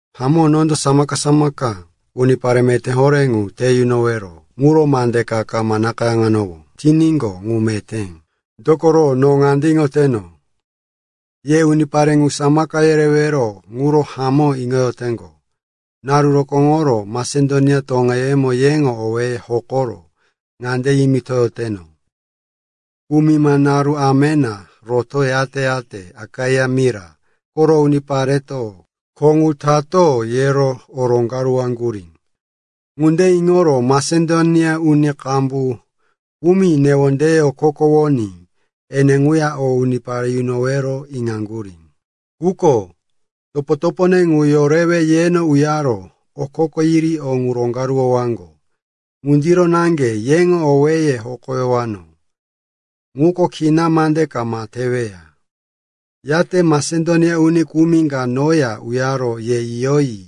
Hamó, nondo samaka-samaka unipare meté horé ŋu te yunowero ŋuro mande ka kama nakayáŋowano tiníqo, ŋu meté. Dokoro no ŋande iŋoteno, ye unipare ŋu samaka yerewero ŋuro hamó iŋoyoteŋgo. Naru rokóŋoro Masedonia toŋeyemo yeŋo owéye hokoro ŋande yimitoyoteno, “Kumima naru amena rotoro, yate-yate Akaia mira koro unipareto, kho ŋu tato, yero o roŋgaruwaŋgurí.” Ŋunde iŋoro Masedonia uni qambu kumi newondeye okokowoní ene ŋuya o unipare yunowero iŋaŋgurí. Quko topo-topone ŋu yorewe yeno uyaro okoko yiri o ŋu roŋgaruwowaŋgo. Ŋundiro naŋge yeŋo owéye hokoyanowó ŋuko kina mande kama teweya. Yate Masedonia uni kumi ka noya uyaro ye yiyoyi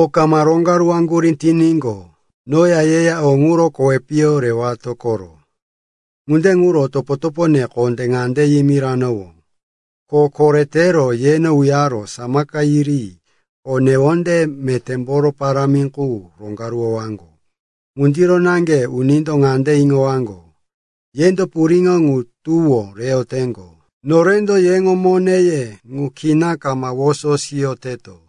o kama roŋgaruwaŋgurí tiníqo, noya yeya o ŋuro kowi piyo rewato koro. Ŋunde ŋuro topo-topone kondé ŋande yimiranowó, ko koretero yeno uyaro samaka yiri o newonde metémboro parámi qu roŋgaruwowaŋgo. Ŋundiro naŋge unindo ŋande iŋowaŋgo, yendo puriŋo ŋu tuwó reyoteŋgo, norendo yeŋo moneye ŋu kina kama woso siyoteto.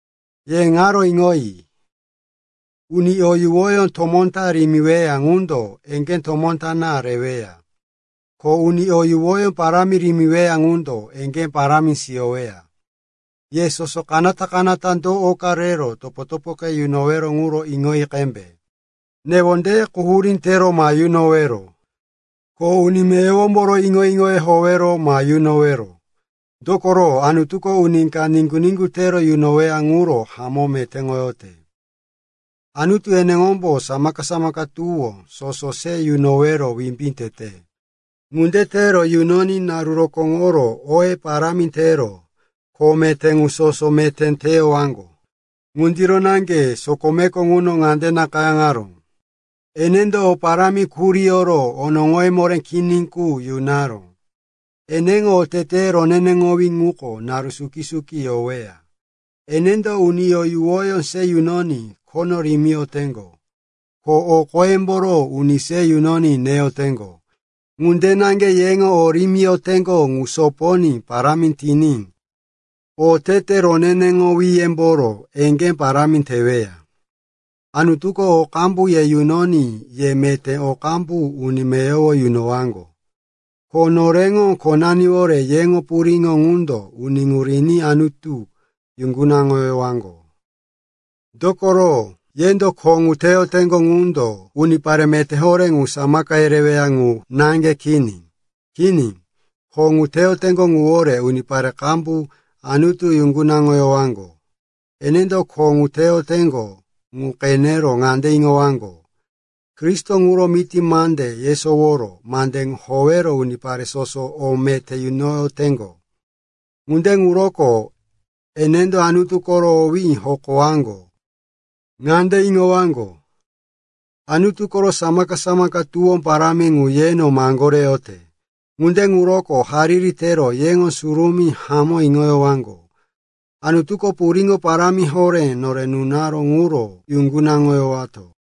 Ye ŋaro iŋoyi. Uni o yuwoyó tomó ta rimiweya ŋundo eŋgé tomó ta reweya. Ko uni o yuwoyó parámi rimiweya ŋundo eŋgé parámi siyoweya. Ye soso kanata-kanata do oka rero topo-topoke yunowero ŋuro iŋoyi qembe. Newonde quhurí tero ma yunowero, ko uni meyowomboro iŋo-iŋoyó howero ma yunowero. Dokoro Anutuko uni ka niŋgu-niŋgu tero yunoweya ŋuro hamó metéŋoyote. Anutu eneŋombo samaka-samaka tuwó soso se yunowero wimbí tete. Ŋunde tero yunoní naru rokóŋoro oye parámi tero kho meté ŋu soso meté teyowaŋgo. Ŋundiro naŋge sokomeko ŋuno ŋande nakayáŋaró, “Enendo o parámi kuriyoro onoŋoye moré kini qu yunaró; eneŋo otete roneneŋowí ŋuko naru suki-suki yoweya.” Enendo uni o yuwoyó se yunoní khono rimiyoteŋgo, ko o qoyemboro uni se yunoní neyoteŋgo. Ŋunde naŋge yeŋo o rimiyoteŋgo ŋu soponí parámi tiní otete roneneŋowíyemboro eŋgé parámi teweya. Anutuko o qambu ye yunoní ye meté o qambu uni meyowo yunowaŋgo. Ko noreŋo khonaniwore yeŋo puriŋo ŋundo uni ŋu riní Anutu yuŋgunaŋoyowaŋgo. Dokoro yendo kho ŋu teyoteŋgo ŋundo unipare meté horé ŋu samaka yereweya ŋu naŋge kini. Kini, kho ŋu teyoteŋgo ŋuwore unipare qambu Anutu yuŋgunaŋoyowaŋgo. Enendo kho ŋu teyoteŋgo ŋu qenero ŋande iŋowaŋgo, Kristo ŋuro miti mande yesoworo mande ŋu howero unipare soso o meté yunoyoteŋgo. Ŋunde ŋuroko enendo Anutu koro owí hokowaŋgo. Ŋande iŋowaŋgo, Anutu koro samaka-samaka tuwó parámi ŋu yeno maŋgoreyote. Ŋunde ŋuroko hariri tero yeŋo surumí hamó iŋoyowaŋgo. Anutuko puriŋo parámi horé nore nunaró ŋuro yuŋgunaŋoyowato.